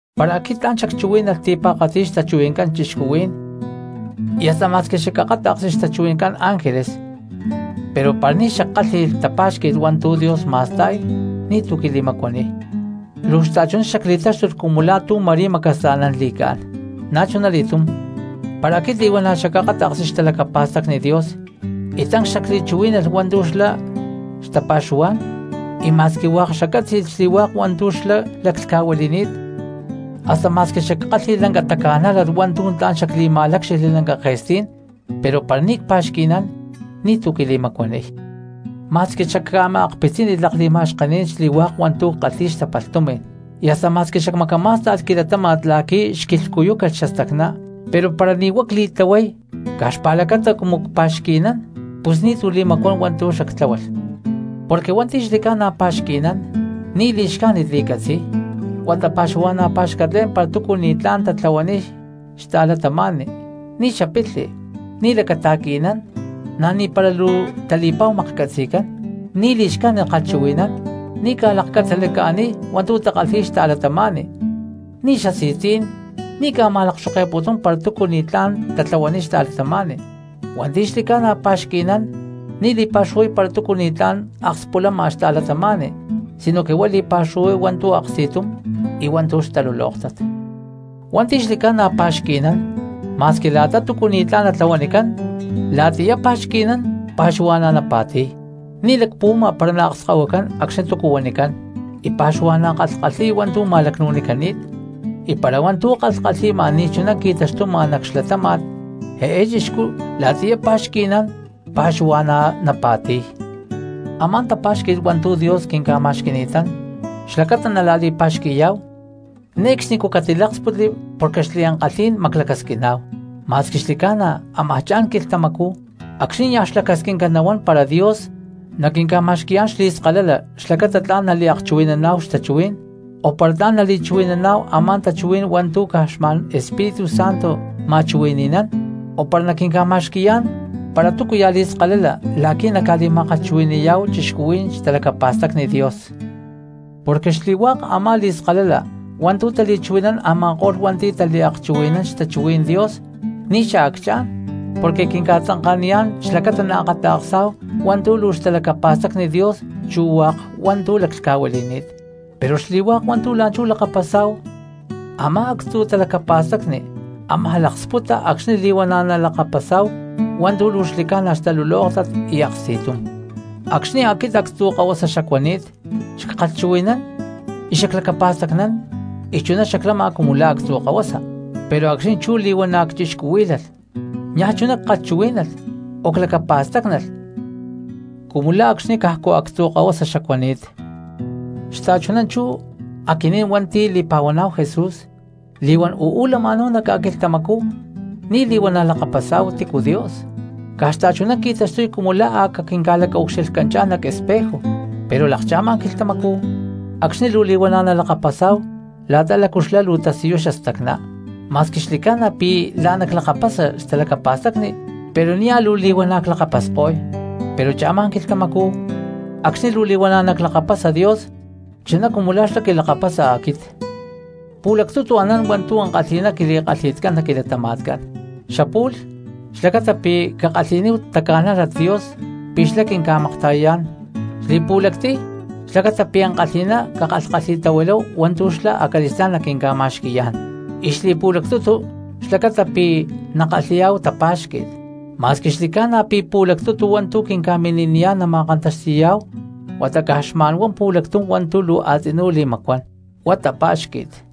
Para aquit tla̠n xacchuhuí̠nalh ti̠pa̠katzi xtachuhui̠ncán cristianos y hasta ma̠squi xacakáta̠ksli xtachuhui̠ncán ángeles, pero para ni̠ xackálhi̠lh tapa̠xqui̠t hua̠ntu̠ Dios ma̠sta̠y ni̠túcu quili̠macuaniy, luu xta̠chuná xacli̠táxtulh cumu la̠ tú ma̠rí macasa̠nán li̠cá̠n. Na̠chunali̠tum para aquit li̠huana̠ xacakáta̠ksli xtalacapa̠stacni Dios y tancs xacli̠chuhuí̠nalh hua̠ntu̠ xlá xtapa̠xuhuá̠n, y ma̠squi hua̠k xaccátzi̠lh xli̠hua̠k hua̠ntu̠ xlá laclhca̠huili̠ni̠t, hasta ma̠squi xackálhi̠lh lanca taca̠nájlat hua̠ntu̠ tla̠n xacli̠ma̠lácxijli lanca ke̠stí̠n, pero para ni̠ cpa̠xqui̠nán ni̠tu̠ quili̠macuaniy. Ma̠squi xacca̠ma̠akpitzínilh lakli̠ma̠xkení̠n xli̠hua̠k hua̠ntu̠ ckalhi̠y xtapalh tumi̠n, y hasta ma̠squi xacmacamá̠stalh quilatáma̠t la̠qui̠ xquilhcuyúcalh xastacná, pero para ni̠ huá cli̠tlahuay caj xpa̠lacata cumu pa̠xqui̠nán pus ni̠tu̠ li̠macuán hua̠ntu̠ xactláhualh. Porque hua̠nti̠ xli̠ca̠na cpa̠xqui̠nán ni̠ li̠xcájnit li̠catzi̠y, huata pa̠xuhua̠na̠ pa̠xcatlé̠n para túcu ni̠tlá̠n tlahuaniy xta̠cristiano; ni̠ xapilhi, ni̠ lacata̠qui̠nán, na̠ ni̠para luu tali̠pa̠hu maklhcatzi̠cán, ni̠ li̠xcájnit kalhchuhui̠nán; ni̠ ca̠lakcatzalaca̠niy hua̠ntu̠ takalhi̠y xta̠cristianos; ni̠ xasi̠tzí̠n; ni̠ ca̠ma̠lakxoke̠putún para túcu ni̠tlá̠n tlahuaniy xta̠cristiano. Hua̠nti̠ xli̠ca̠na pa̠xqui̠nán ni̠ li̠pa̠xuhuay para túcu ni̠tlá̠n akspulama xta̠cristiano, sinoque huá li̠pa̠xuhuay hua̠ntu̠ aksti̠tum y hua̠ntu̠ xtalulóktat. Hua̠nti̠ xli̠ca̠na ca̠pa̠xqui̠y xta̠cristianos, ma̠squi la̠ta túcu ni̠tlá̠n natlahuanicán la̠tiyá pa̠xqui̠nán pa̠xuhua̠na̠ napa̠ti̠y; ni̠ lacpuhuama para naakskahuicán acxni̠ túcu huanicán, y pa̠xuhua̠na̠ kalhkalhi̠y hua̠ntu̠ ma̠lacnu̠nicani̠t, y para hua̠ntu̠ kalhkalhi̠ma ni̠chuná qui̠taxtuma nac xlatáma̠t eé cristiano la̠tiyá pa̠xqui̠nán pa̠xuhua̠na̠ napa̠ti̠y. Amá tapa̠xqui̠t hua̠ntu̠ Dios quinca̠ma̠xqui̠ni̠tán xlacata nala̠li̠pa̠xqui̠yá̠hu, ne̠cxnicú catiláksputli porque xliankalhí̠n maclacasquiná̠hu, ma̠squi xli̠ca̠na ámaj cha̠n quilhtamacú acxní niaj xlacasquinca nahuán para Dios naquinca̠ma̠xqui̠yá̠n xli̠skalala xlacata tla̠n naliakchuhui̠naná̠hu xtachuhuí̠n o para tla̠n nali̠chuhui̠naná̠hu a̠má tachuhuí̠n hua̠ntu̠ caj xma̠n Espíritu Santo ma̠chuhui̠ni̠nán, o para naquinca̠ma̠xqui̠yán para túcuya̠ xli̠skalala la̠qui̠ naca̠li̠ma̠kalhchuhui̠ni̠yá̠hu cristianos xtalacapa̠stacni Dios. Porque xli̠hua̠k a̠má li̠skalala hua̠ntu̠ tali̠chuhui̠nán a̠ma̠ko̠lh hua̠nti̠ taliakchuhui̠nán xtachuhuí̠n Dios ni̠ xaacchá̠n, porque quinca̠tzanka̠niyá̠n xlacata nalakapasá̠hu hua̠ntu̠ luu xtalacapa̠stacni Dios chu hua̠k hua̠ntu̠ laclhca̠huili̠ni̠t. Pero xli̠hua̠k hua̠ntu̠ la̠nchú lakapasá̠hu u̠má actzu̠ talacapa̠stacni ámaj laksputa acxni̠ li̠huana̠ nalakapasá̠hu hua̠ntu̠ luu xli̠ca̠na xtalulóktat y aksti̠tum. Acxni̠ aquit actzu̠ kahuasa xacuani̠t, xackalhchuhui̠nán, xaclacapa̠stacnán y chuná xaclama cumu la̠ actzu̠ kahuasa, pero acxní chú li̠huana̠ cchixcuhuí̠lalh niaj chuná ckalhchuhuí̠nalh o clacapa̠stácnalh cumu la̠ acxni̠ cajcu actzu̠ kahuasa xacuani̠t. Xta̠chuná chú aquinín hua̠nti̠ li̠pa̠huaná̠hu Jesús, li̠huán uú lama̠náhu nac ca̠quilhtamacú ni̠ li̠huana̠ lakapasá̠hu tícu Dios, caj xta̠chuná qui̠taxtuy cumu la̠ a̠ caquinca̠lacaucxilhcanchá̠n nac espejo. Pero lakcha̠ma quilhtamacú acxní luu li̠huana̠ nalakapasá̠hu la̠ta lácu xlá luu tasiyuy xastacná. Ma̠squi xli̠ca̠na pi̠ la̠ná clakapasa xtalacapa̠stacni, pero nia̠ luu li̠huana̠ clakapasko̠y, pero cha̠ma quilhtamacú acxní luu li̠huana̠ naclakapasa Dios chuná cumu la̠ xlá quilakapasa aquit. Pu̠lactutu anán hua̠ntu̠ ankalhi̠ná quili̠kalhi̠tcán nac quilatama̠tcán: xapu̠lh xlacata pi̠ cakalhi̠níhu taca̠nájlat Dios pi̠ xlá quinca̠makta̠yayá̠n, xli̠pu̠lactiy xlacata pi̠ ankalhi̠ná cakalhkalhi̠tahuiláhu hua̠ntu̠ xlá acali̠stá̠n naquinca̠ma̠xqui̠yá̠n, y xli̠pu̠lactutu xlacata pi̠ nakalhi̠yá̠hu tapa̠xqui̠t. Ma̠squi xli̠ca̠na pi̠ pu̠lactutu hua̠ntu̠ quinca̠mini̠niyá̠n nama̠kantaxti̠yá̠hu huata caj xma̠n pu̠lactum hua̠ntu̠ luu a̠tzinú li̠macuán, huá tapa̠xqui̠t.